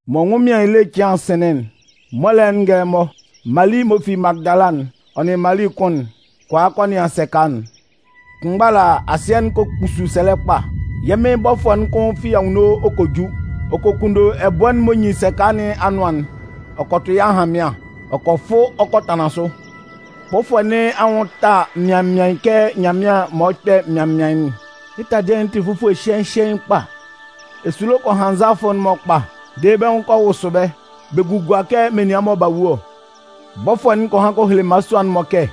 Mɔ ɛnwʋnmɩan ele cɩan'n sɩnlɩn'n, mɔlɛ'n ngɛlɛmɔ, Mali m'ɔ fi Magɩdala'n, ɔ nʋn Mali kʋn'n kɔ a kɔ nɩan sɛka'n. Kʋnmgba ala, asɩɛ'n kɔ kpusu sɛlɛ kpa. Yɛ́ Mɩn bɔfʋɛ'n kʋn fi anwunno ɔ kɔ ju. Ɔ kɔ kunndo ɛbʋɛ'n m'ɔ nyin sɛka nɩn anʋan'n ɔ kɔ tʋ yɩ́ ahanmɩan ɔ kɔ fʋ ɔ kɔ tanlan sʋ. Bɔfʋɛ nɩn anwʋn'n ta sʋa mɩaɩn mɩaɩn kɛ nyanmɩan'n m'ɔ kpɛ mɩaɩn mɩaɩn'n. Yɩ́ taladɩɛ'n tɩ fufue hyɩɛɩn hyɩɛɩn kpa. Esulo kɔ han nzalafʋ'n-mɔ kpa dede bɛ́ nwʋn kɔ wʋsʋ bɛ́, bɛ gugua kɛ menian mɔ b'a wu ɔ. Bɔfʋɛ'n kɔ han kɔ hele mmalasua'n-mɔ kɛ: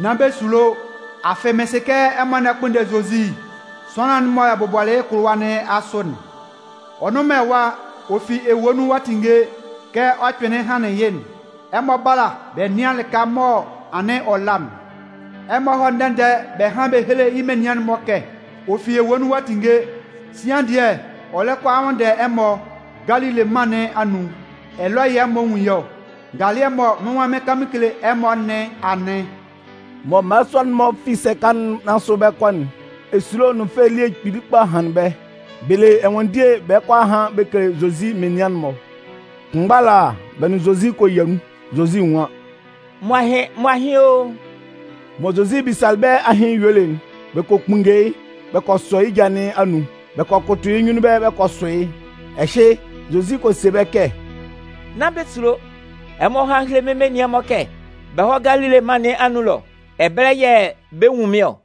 “Nán bɛ sulo. Afɩ mɩn sɩ kɛ ɛmɔ lɛ kpʋnndɛ Zozi, sʋanlan'n mɔ bɛ bʋbɔlɩ yɩ́ kʋlʋwa nɩn asʋ'n. Ɔ nnʋn man ɛwa. Ɔ fi ewue nun ɔ'a tinnge kɛ ɔ kpɩnlɩn hanlɩn yɩ́'n. Ɛmɔ bála bɛ nɩ́an lɩka mɔ anɩn ɔ la'n. Ɛmɔ hɔ́ ndɛ-ndɛ bɛ hán héle yɩ́ menian'n-mɔ kɛ ɔ fi ewue nun ɔ'a tinnge. Sian dɩɛ, ɔ lɛ kɔ a nwʋnndɛ ɛmɔ Galile mân nɩn anun. Ɛlɔ yɛ̂ ɛmɔ 'nwun yɩ́ ɔ. Ngalɩɛ'n mɔ mɩ́n nwan mɩn 'kan mɩn kele ɛmɔ nɩn anɩn.” Mɔ mmalasua'n-mɔ fi sɛka nɩn asʋ bɛ 'kɔ'n, esulo nʋn fɛ elie kpili kpa hanlɩn bɛ́. Bɛ le ɛnwanndie bɛ lɛ kɔ a han bɛ kele Zozi menian'n-mɔ. Kʋnmgba ala, bɛ nʋn Zozi kɔ yia nun. Zozi nwan: “M mo ahɩn, m mo ahɩn o!” Mɔ Zozi bisalɩ bɛ́ ahɩn yuelɩ'n, bɛ kɔ kpunnge yɩ́ bɛ kɔ sɔ yɩ́ ja nɩn anun, bɛ kɔ kʋtʋ yɩ́ nyunnun ɛbɛlɛ bɛ kɔ sʋ yɩ́. Ɛhɩ, Zozi kɔ se bɛ́ kɛ: “Nán bɛ sulo. Ɛmɔ hɔ́ hán héle mɩ́n nianman'n-mɔ kɛ bɛ hɔ́ Galile mân nɩn anun ɛlɔ. Ɛbɛlɛ yɛ̂ bɛ 'nwun mɩ́n ɔ.”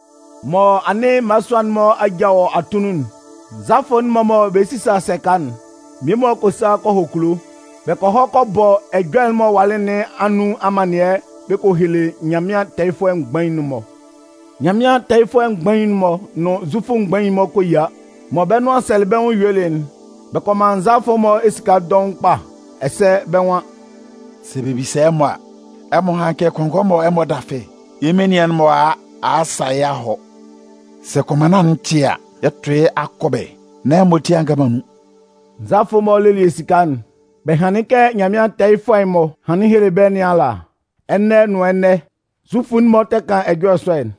Mɔ anɩn mmalasua'n-mɔ aja wɔ atunnun'n, nzalafʋ'n-mɔ mɔ bɛ lɛ sisa sɛka'n, mmie-mɔ kɔ sa kɔ hɔ kulo. Bɛ kɔ hɔ kɔ bɔ ɛjɔlɛ'n m'ɔ walɩ nɩn anun amannɩɛ bɛ kɔ hele Nyanmɩan tɛɛyɩfʋɛ mgbain'n-mɔ. Nyanmɩan tɛɛyɩfʋɛ mgbain'n-mɔ nʋn Zufʋ mgbain'n-mɔ kɔ yia. Mɔ bɛ́ nʋan sɛlɩ bɛ́ nwʋn yuelɩ'n, bɛ kɔ man nzalafʋ'n-mɔ esika dɔʋn kpa. Ɛsɛ bɛ́ nwan: “Sɛ bɛ bisa ɛmɔ a, ɛmɔ hán kɛ kɔngɔɛ mɔ ɛmɔ 'dafɩ'n, yɩ́ menian'n-mɔ a a a sa yɩ́ a hɔ. Sɛ kʋnmanna'n tɩ a, yɛ 'tʋ yɩ́ akɔbɛ nán ɛmɔ ati a nga man nun.” Nzalafʋ'n-mɔ lelɩ esika'n, bɛ hanlɩn yɩ́ kɛ Nyanmɩan tɛɛyɩfʋɛ mgbain'n-mɔ hanlɩn helelɩ bɛ́ nɩn ala. Ɛnɛ nʋn ɛnɛ, Zufʋ'n-mɔ tɛ kan ɛjɔlɛ sɔ'n.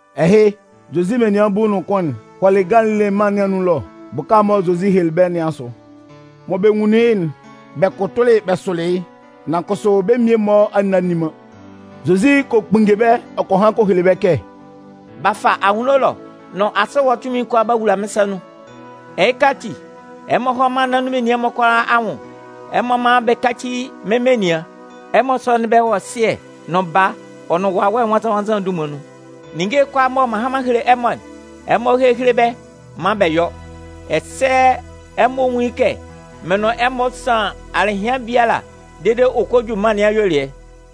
Ɛhɩ, Zozi menian bulu nʋn kʋn'n hɔlɩ Galile mân nɩn anun ɛlɔ bʋka'n mɔ Zozi helelɩ bɛ́ nɩn asʋ. Mɔ bɛ nwunlin yɩ́'n, bɛ kʋtʋlɩ bɛ sʋlɩ yɩ́. Nan kʋsʋ bɛ́ mmie-mɔ a nne a nni man. Zozi kɔ kpunnge bɛ́, ɔ kɔ han kɔ hele bɛ kɛ: “B'a fa anwunno ɛlɔ nʋn asɩ ɛwa tunmin'n kʋalaa b'a wula mɩ́n sa nun. Ɛhɩka ati, ɛmɔ hɔ́ mân nɩn anun menian'n-mɔ kʋalaa anwʋn, ɛmɔ mán bɛ káci mɩ́n menian. Ɛmɔ sɔ́nɩn bɛ́ wɔ Sɩɛ nʋn Baa, ɔ nʋn Wawɛ Nwannzan-nwannzan'n dunman nun. Ninnge'n kʋalaa mɔ m'an han m'an hele ɛmɔ'n, ɛmɔ héhele bɛ́ maan bɛ yɔ́. Ɛsɛ ɛmɔ nwún yɩ́ kɛ mɩn nʋn ɛmɔ san alɩhɩan biala dede ɔ kɔ ju mân nɩn ayuelɩɛ.”